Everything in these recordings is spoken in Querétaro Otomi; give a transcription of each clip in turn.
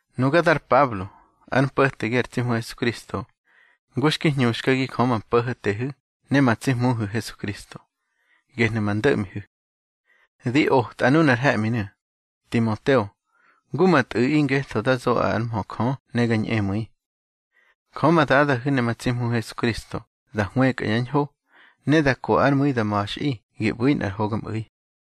Nuga dar Pablo, ár mpo̱tegi ar tsi Hmu Hesukristo, ngu xki hñuxkagi Jö ma Po̱ho̱tehu̱ ne ma tsi Hmuhu̱ Hesukristo, gehnu̱ ma ndo̱ꞌmihu̱. Di otꞌa nunar he̱ꞌminu̱, Timoteo, ngu ma tꞌu̱ꞌi, ngetho da zoꞌaꞌi ár mhö Jö ne ga ñꞌemu̱i. Jö ma Dadahu̱ ne ma tsi Hmuhu̱ Hesukristo da hwëkꞌa yá ñho, ne da ko ár mu̱i da ma̱xꞌi gi ꞌbu̱ nꞌar hogamꞌu̱i.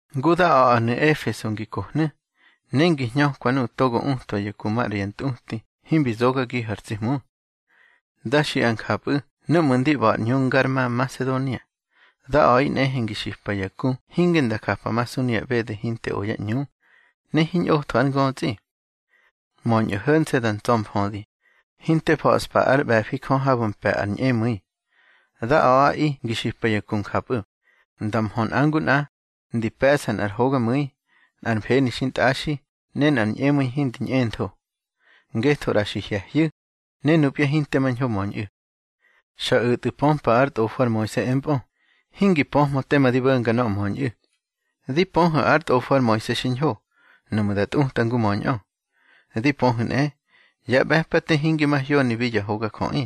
Ngu da a̱ꞌanu̱ Efeso ngi kohnu̱, ne ngi hñökwa nuꞌu̱ togo utwa ya ku maꞌra ya ntꞌuti himbi zogagihu̱ ar tsi Hmu. Da xiꞌa njapꞌu̱ núꞌmu̱ ndi ꞌba̱ ar ꞌñu ngar ma Nmasedonia. Da a̱ꞌi nꞌehe ngi xipa ya ku hinge nda japamasu nuya ꞌbede hinte o yá ꞌñu, ne hiñꞌotho ár ngötsꞌi. Möñꞌu̱ ho̱nse̱ da ntsa̱mfödi, hinte fa̱ꞌspa ár ꞌbe̱fi Jö habu̱ mpe̱ ar ñꞌemu̱i. Da a̱ꞌaꞌi ngi xipa ya ku njapꞌu̱, nda mhö nꞌa ngu nꞌa, ndi pe̱ꞌsa nꞌar hogamu̱i, nꞌar mfeni xintꞌaxi, ne nꞌar ñꞌemu̱i hindi ñꞌentho. Ngetho ꞌra xi hye̱hyu̱, ne nupya hinte mañho möñꞌu̱. Xa o̱tꞌu̱ pömpa ár tꞌofo ar Moise empꞌö, hingi pöhmö tema di bo̱nga nöꞌö möñꞌu̱. Di pöhu̱ ár tꞌofo ar Moise xiñho, nuꞌmu̱ da tꞌuta ngu möñꞌö. Di pöhu̱ nꞌe, ya ꞌbe̱pate hinge mahyonibi ya hogajöꞌi.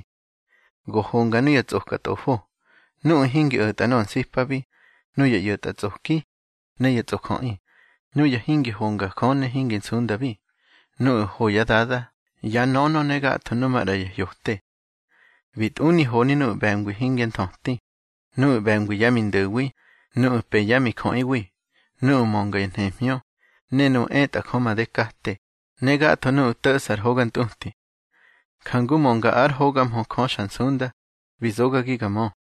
Go honga nuya tsꞌoka tꞌofo, nuꞌu̱ hingi o̱tꞌa nöꞌö nsipabi, nuya ꞌyo̱tꞌatsꞌoki ne ya tsꞌojöꞌi, nuya hingi honga Jö ne hingi nsundabi, nuꞌu̱ ho yá dada, yá nönö, ne gatho numaꞌra ya hyote. Bi tꞌuni honi nuꞌu̱ ꞌbe̱ngwi hingyá nthöti, nuꞌu̱ ꞌbe̱ngwi yá mindo̱wi, nuꞌu̱ pë yá mijöꞌiwi, nuꞌu̱ mönga ya nhemhñö, ne nuꞌu̱ etꞌa Jö made kate, ne gatho nuꞌu̱ to̱ꞌsa ar hoga ntꞌuti. Jangu mönga ár hoga mhö Jö xa nsunda, bi zogagi ga mö.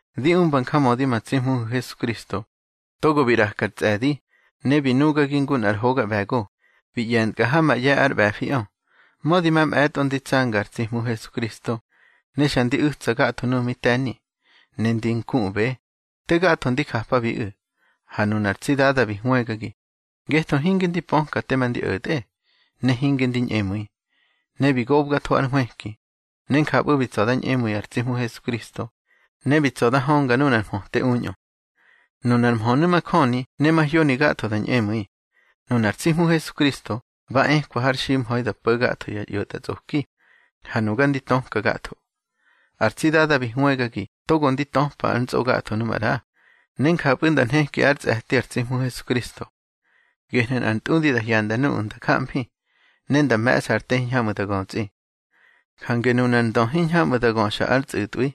Di umba njamödi ma tsi Hmuhu̱ Hesukristo, togo bi ꞌraka ar tsꞌe̱di, ne bi nugagi ngu nꞌar hoga ꞌbe̱go, bi ꞌye̱ntkꞌa ha ma ꞌye̱ ár ꞌbe̱fiꞌö. Mödi mamꞌe̱tꞌo ndi tsanga ar tsi Hmu Hesukristo, ne xa ndi u̱tsa gatho nuꞌu̱ mi te̱ni, ne ndi nkuꞌbe, te gatho ndi japabiꞌu̱. Ha nunar tsi Dada bi hwëgagi, ngetho hinge ndi pöka tema ndi o̱tꞌe, ne hinge ndi ñꞌemu̱i. Ne bi gobgatho ár nhwëki, ne njapꞌu̱ bi tsa̱ da ñꞌemu̱i ar tsi Hmu Hesukristo, ne bi tsa̱ da hönga nunar mhöte uñꞌö. Nunar mhönu̱ majöni ne mahyoni gatho da ñꞌemu̱i: Nunar tsi Hmu Hesukristo ba ekwa har ximha̱i da po̱ gatho ya ꞌyo̱tꞌatsꞌoki, ha nuga ndi töka gatho. Ar tsi Dada bi hwëgagi togo ndi töpa ár ntsꞌo gatho nu maꞌra, ne njapꞌu̱ nda nheki ár tsꞌe̱ti ar tsi Hmu Hesukristo. Gehnu̱ nꞌar ntꞌudi da hyanda nuꞌu̱ nda jamfi, ne nda me̱ꞌsa ar te hiñhamꞌu̱ da götsꞌi. Jange nunar Ndö hiñhamꞌu̱ da göxa ár tsꞌu̱tꞌwi,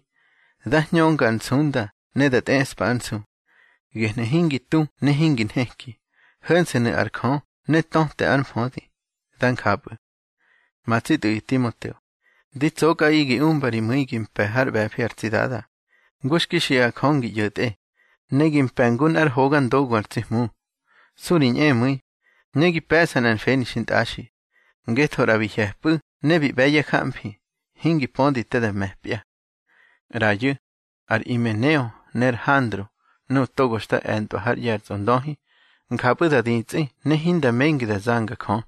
dá hñönga ar nsunda ne da tꞌeꞌspa ár nsu. Gehnu̱ hingi tu ne hingi nheki, ho̱nse̱nu̱ ar Jö ne töte ár mfödi. Dá njapꞌu̱. Ma tsi tꞌu̱ꞌi Timoteo, di tsokꞌaꞌi gi umba ri mu̱i gi mpe̱ hár ꞌbe̱fi ar tsi Dada, ngu xki xiꞌa Jö ngi ꞌyo̱tꞌe, ne gi mpe̱ ngu nꞌár hoga ndogu ar tsi Hmu. Su ri ñꞌemu̱i, ne gi pe̱ꞌsa nꞌar mfeni xintꞌaxi, ngetho ꞌra bi hye̱pꞌu̱ ne bi ꞌbe̱ yá jamfi, hingi pödi te da me̱pya. ꞌRayu̱, ar Imeneo ne ar Handro nuꞌu̱ togo xta e̱ntꞌwa hár ꞌye̱ ar Tsꞌondöhi, njapꞌu̱ da ditsꞌi ne hinda mengi da zanga Jö.